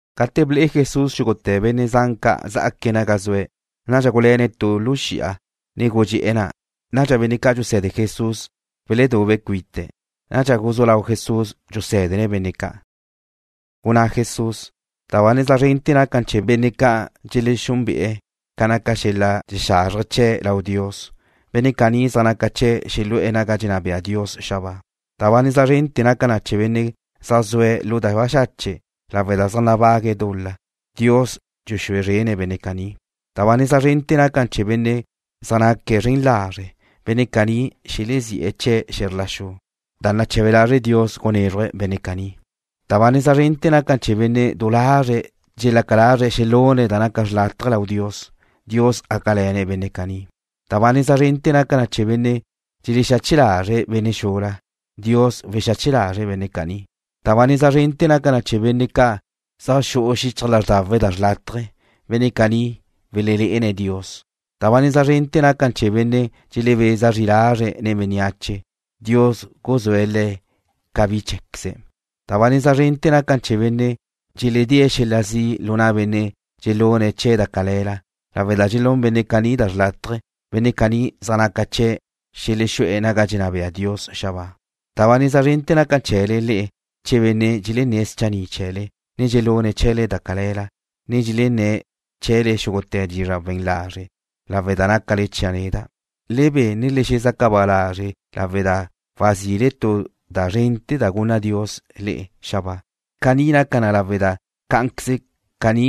Gate ble'e Jesús xúgute̱ benne' zan ca' zá'aque̱' naga zue̱', nadxa guluéne̱' tu lu xi'a, ne gudxé'e̱ na'. Nadxa benne' ca' dxuse̱de Jesús beledube̱' cuite̱'. Nadxa guzú lau Jesús dxusé̱dene̱' benne' ca'. Gunná Jesús: ―Da ba neza zrente̱ naca na chee̱ benne' ca' dxelexúnbe'e̱ ca naca xel-la' dxexazrje chee̱' lau Dios. Benne' caní zaj naca chee̱' xelexú'e̱ naga dxenná bea Dios xabáa. ’Da ba neza zrente̱ naca na chee̱ benne' ca' dxelelé'ele̱' zaj zue̱' lu da baxache' lawe' da zaj nabague̱' dul-la. Dios dxexúe zrene̱' benne' caní. ’Da ba neza zrente̱ naca na chee̱ benne' zaj naque̱' zren lazre'. Benne' caní xelezí'e̱ chee̱' xe̱zr la xu da nache̱be lazre' Dios gunézruje̱' benne' caní. ’Da ba neza zrente̱ naca na chee̱ benne' du lazre' dxelaca lazre̱' xelune̱' da naca xrlátaje lau Dios. Dios gácale̱ne̱' benne' caní. ’Da ba neza zrente̱ naca na chee̱ benne' dxelexexache lazre̱' benne' xula. Dios wexache lazre̱' benne' caní. ’Da ba neza zrente̱ naca na chee̱ benne' ca' zaj xu'u xichaj lázrdawe̱' da xrlátaje. Benne' caní welelé'ene̱' Dios. ’Da ba neza zrente̱ naca na chee̱ benne' dxelebeza zri lazre̱' nen bénneache. Dios guzúe̱' le̱' ca bi cheé̱queze̱'. ’Da ba neza zrente̱ naca na chee̱ benne' dxeledée̱' xel-la' zi' lu na' benne' ca' dxelune̱' chee̱' da cale̱la cate' dxelune̱' da xrlátaje. Benne' caní zaj naca chee̱' xelexú'e̱ naga dxenná bea Dios xabáa. ’Da ba neza zrente̱ naca na chee̱le le'e che benne' dxelenné̱' schanni' chee̱le, ne dxelune̱' chee̱le da cale̱la, ne dxelenné̱' chee̱le xúgute̱ dizra' we̱n lazre' lawe' da nácale chia' neda'. Le be, ne le xezaca ba lázrele lawe' da wazile tu da zrente̱ da gunna Dios le'e xabáa. Caní gaca na lawe' da cá'anqueze caní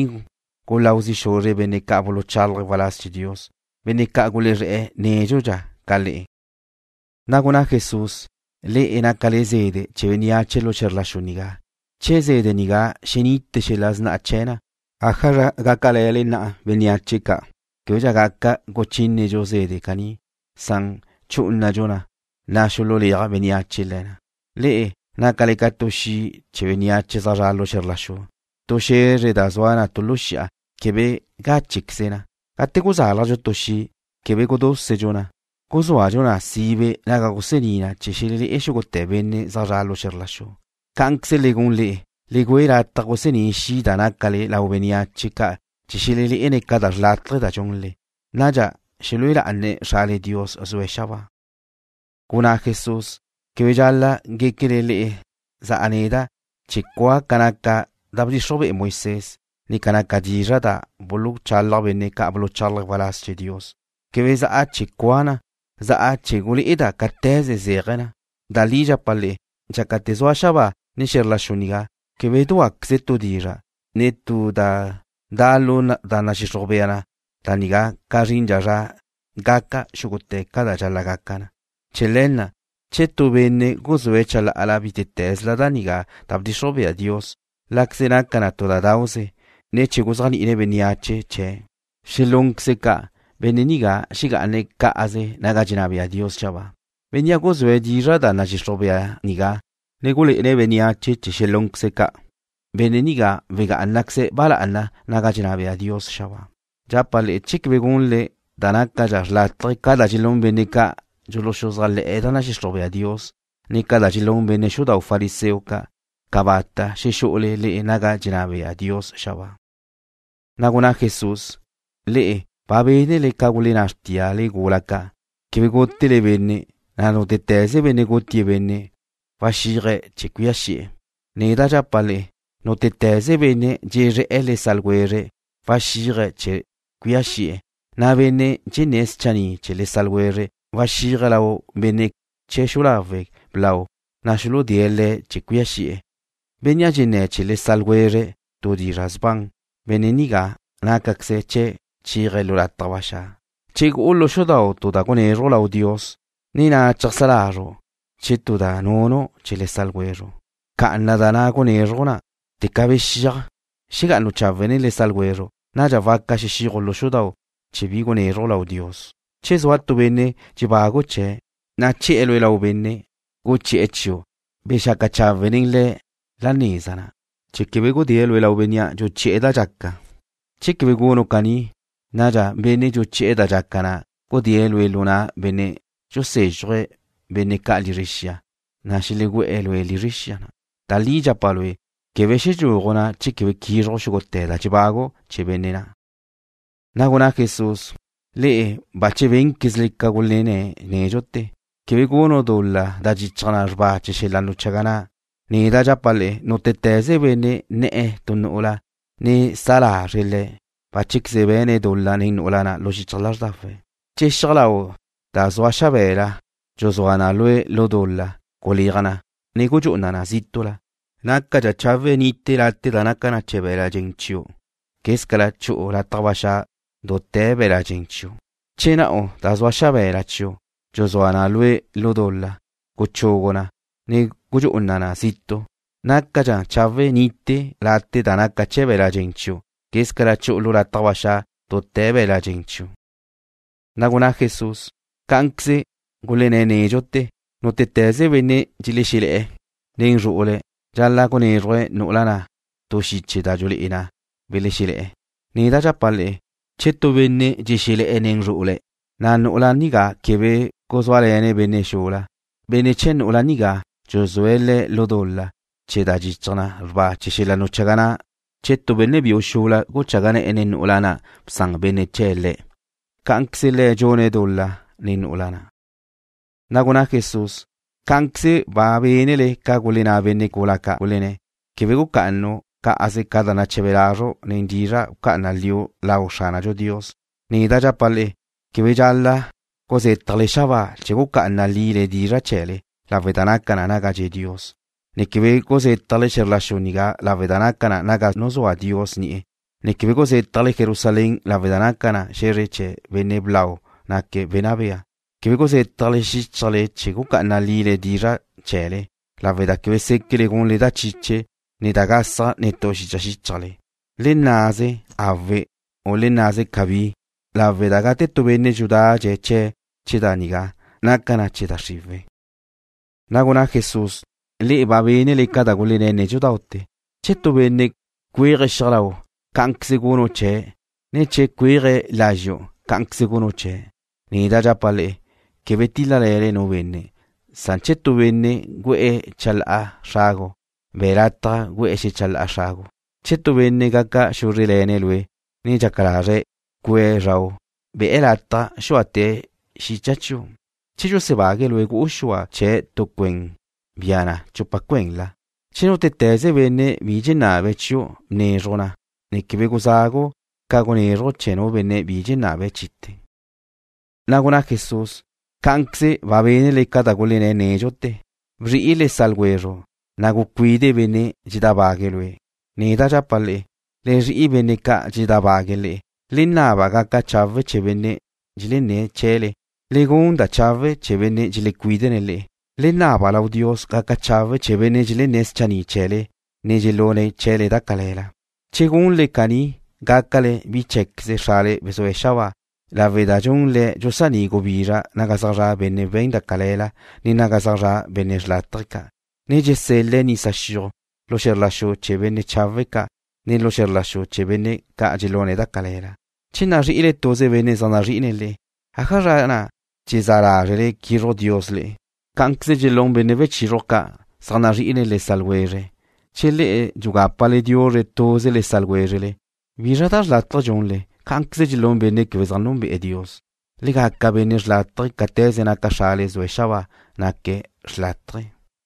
guláu zi' xuzre̱' benne' ca' buluchálaje̱' waláz chee̱ Dios, benne' ca' gulezré̱'e̱ nédxudxa ca le'e. Na' gunná Jesús: ―Le'e nácale ca zede' chee̱ bénneache lu xe̱zrla xu nigá. Che zede' nigá xenite xel-la' sna'a chee̱ na, ¿ájazra gácale̱le bénneache ca'? Québedxa gaca guchínedxu zede' caní. ¡Chú'unadxu na, na' xululéaj bénneache le̱ na! ’Le'e nácale ca tu xi' chee̱ bénneache zaj zre̱'e̱ xe̱zr la xu. Tu xe̱zre da zua na tu lu xi'a, quebe gáchequeze na. Gate guzálajdxu tu xi', quebe gudúsedxu na. Guzúadxu na sibe naga gusení na chee̱ xelelé'e xúgute̱ benne' zaj zre̱'e̱ lu xu'u. Cá'anqueze le gun le'e. Le güe lataj gusení xi' da nácale lau bénneache ca' chee̱ xelelé'ene̱' ca da xrlátaje da dxunle. Nadxa xelúe lá'ane̱' Xrale Dios zue̱' xabáa. Gunná Jesús: ―Quebe dxal-la' guéquele le'e za'a neda' chee̱ cua' ca naca da bdxixruj be'e Moisés, ne ca naca dizra' da buluchalaj benne' ca' buluchálaje̱' waláz chee̱ Dios. Quebe za'a chee̱ cua' na. Za'a chee̱ gulé'eda' cáte̱ze zéaje̱ na. Da li dxapa' le'e. Dxácate̱ zaj zua xabáa, ne xe̱zr la xu nigá, quebe dúaqueze tu dizra', ne tu da da' lu da nadxixruj bea na nigá ca zrindxa zra gaca xúgute̱ ca da dxal-la' gaca na. Chee̱ le̱ na', che tu benne' guzúe̱' chalá'ala bítete̱zla da nigá da bdxixruj bea Dios, láqueze naca na tu da dauze, ne che guzéajni'ine̱' bénneache chee̱ xelúnqueze̱' ca', benne' nigá xegá'ane̱' cá'aze naga dxenná bea Dios xabáa. Bénnea' guzúe̱' dizra' da nadxixruj bea nigá, ne gulé'ene̱' bénneache chee̱ xelúnqueze̱' ca', benne' nigá wegá'anaqueze̱' ba lá'ana naga dxenná bea Dios xabáa. Dxapa' le'e, che quebe gunle da nácadxa xrlátaje ca da dxelún benne' ca' dxuluxuzájle̱'e̱ da nadxixruj bea Dios, ne ca da dxelún benne' xudau' fariseo ca', cabata' xexú'ule le'e naga dxenná bea Dios xabáa. Na' gunná Jesús: ―Le'e ba bénele ca gulenná xrtíale gula ca': “Quebe gútele benne',” na' “Nútete̱ze benne' gutie̱' benne' waxíaje̱' chee̱ cuía xi'e̱.” Neda' dxapa' le'e, nútete̱ze benne' dxezré̱'e̱ le sa' ljwezre̱' waxíaje̱' chee̱ cuía xi'e̱. Na' bénnea' dxenné̱' schanni' chee̱ le sa' ljwezre̱' waxíaje̱' lau benne' chee̱ xu'u lawe' blau, na' xuludée̱' le̱' chee̱ cuía xi'e̱. Bénnea' dxenné̱' chee̱ le sa' ljwezre̱' tu dizra' sban, benne' nigá nácaqueze chee̱' chéaje̱' lu lataj ba xa'. ’Che gu'u lu xudau' tu da gunézruju' lau Dios, ne na' cheajsá lazru' chee̱ tu da nunu' chee̱ le sa' ljwezru', bca'ana da na' gunézruju' na', teca xexíaju' xegá'anu' chawe' nen le sa' ljwezru'. Nadxa waca xexíaju' lu xudau' chee̱ bi gunézruju' lau Dios. ’Che zua nu benne' dxebagu' chee̱', na' che̱'e̱ lue' lau benne' guchi'e̱ chiu', bexaca chawe' nen le̱' la neza na', chee̱ quebe gudée̱' lue' lau bénnea' dxuchi'e̱ da dxaca. Che quebe gunu' caní, nadxa benne' dxuchi'e̱ da dxaca na' gudée̱' lue' lu na' benne' dxusézxuje̱' bénne' ca' lizre xia, na' xelegú'e̱ lue' lizre xia na'. Da li dxapa' lue'. Quebe xedxúaju' na' che quebe quízruju' xúgute̱ da dxebagu' chee̱ benne' na'. Na' gunná Jesús: ―Le'e bache bénquezle ca gulenné̱' nédxute̱: “Quebe gunu' dul-la da dxichaj na xrba chee̱ xel-la' nuchaga na'.” Neda' dxapa' le'e, nútete̱ze benne' ne̱'e̱ tu nu'ula, ne sa lazre̱' le̱', báchequeze be̱ne̱' dul-la nen nu'ula na' lu xichaj lázrdawe̱'. ’Che xiaj lau' da zua xabe̱la dxuzúa na lue' lu dul-la, guleaj na, ne gudxú'una na zítu'la. Nácadxa chawe' nite late' da naca na chee̱ be̱l-la' dxen chiu' quézcala chu'u lataj ba xa' dute̱ be̱l-la' dxen chiu'. Che na'u da zua xabe̱la chiu' dxuzúa na lue' lu dul-la, guchugu na, ne gudxú'una na zitu'. Nácadxa chawe' nite late' da naca na chee̱ be̱l-la' dxen chiu', quézcala chu'u lataj ba xa' dute̱ be̱l-la' dxen chiu'. Na' gunná Jesús: ―Cá'anqueze gulenné̱' nédxute̱: “Nútete̱ze benne' dxexelé̱'e̱ nen zru'ule̱', dxal-la' gunézruje̱' nu'ula na' tu xiche da dxulé'e na belexelé̱'e̱.” Neda' dxapa' le'e, che tu benne' dxexelé̱'e̱ nen zru'ule̱', na' nu'ula nigá quebe guzúale̱ne̱' benne' xula, benne' chee̱ nu'ula nigá dxuzúe̱' le̱' lu dul-la chee̱ da dxichaj na xrba chee̱ xel-la' nuchaga na' che tu benne' biu xula guchaga ne̱'e̱ nen nu'ula na' bsan benne' chee̱' le̱'. Cá'anqueze le̱' dxune̱' dul-la nen nu'ula na'. Na' gunná Jesús: ―Cá'anqueze ba bénele ca gulenná benne' gula ca', gulenné̱': “Quebe gucá'anu' cá'aze ca da nache̱be lazru' nen dizra' bca'ana liu' lau Xránadxu Dios.” Neda' dxapa' le'e: Quebe dxal-la' guzétjale xabáa chee̱ guca'ana lile dizra' chee̱le, lawe' da naca na naga dxe' Dios, ne quebe guzétjale xe̱zr la xu nigá lawe' da naca na naga nuzúa Dios ni'e̱, ne quebe guzétjale Jerusalén lawe' da naca na xe̱zre chee̱ Benne' Blau naque̱' Wenná Bea. Quebe guzétjale xíchajle chee̱ guca'ana lile dizra' chee̱le lawe' da quebe séquele gunle da chiche, ne da gasaj netú xicha xíchajle. Le nnaze: “Awe',” u le nnaze: “Cabí,” lawe' da gate tu benne' dxudadxe̱' chee̱' chee̱ da nigá, naca na chee̱ da xriwe̱'. Na' gunná Jesús: ―Le'e ba bénele ca da gulenné̱' nédxute̱: “Che tu benne' cuéaje̱' xiaj lau', cá'anqueze gunu' chee̱', ne che cuéaje̱' lazxu', cá'anqueze gunu' chee̱'.” Neda' dxapa' le'e, quebe tíl-lale̱le nu benne', san che tu benne' gu'e̱ chalá'a xragu', be̱' lataj gu'e̱ xechalá'a xragu'. Che tu benne' gaca xúzre'le̱ne̱' lue', ne dxaca lazre̱' cue̱' zrau', be̱' lataj xúate̱' xicha chiu'. Che dxulusebágue̱' lue' gu'u xua chee̱' tu cuéndau', bia na chupa cuenla. Che nútete̱ze benne' bi dxenabe̱' chiu', bnézruje̱' na, ne quebe guzagu' ca gunézruju' chee̱ nu benne' bi dxenabe̱' chite̱. Na' gunná Jesús: ―Cá'anqueze ba bénele ca da gulenné̱' nédxute̱: “Bzri'i le sa' ljwezru', ne gucuide benne' dxedábague̱' lue'.” Neda' dxapa' le'e, le zri'i benne' ca' dxeledábague̱' le'e. Le naba gaca chawe' chee̱ benne' dxelenné̱' chee̱le. Le gun da chawe' chee̱ benne' dxelecuídene̱' le'e. Le naba lau Dios gaca chawe' chee̱ benne' dxelenné̱' schanni' chee̱le ne dxelune̱' chee̱le da cale̱la. Che gunle caní gácale bi cheé̱queze Xrale zue̱' xabáa, lawe' da dxun Le̱' dxusaní' gubizra naga zaj zra' benne' we̱n da cale̱la ne naga zaj zra' benne' xrlátaje ca', ne dxusel-la' nisa xiuj lu xe̱zr la xu chee̱ benne' chawe' ca', ne lu xe̱zr la xu chee̱ benne' ca' dxelune̱' da cale̱la. Che nazrí'ile tuze benne' zaj nazrí'ine̱' le'e, ¿ájazra na' dxezá lázrele quizruj Dios le'e? Cá'anqueze dxelún benne' wechizruj ca', zaj nazrí'ine̱' le sa' ljwezre̱'. Che le'e dxugápale diuzre tuze le sa' ljwézrele, ¿bizra da xrlátaje dxunle? Cá'anqueze dxelún benne' quebe zaj núnbe'e̱ Dios. Le gaca benne' xrlátaje cáte̱ze naca Xrale zue̱' xabáa, naque̱' xrlátaje.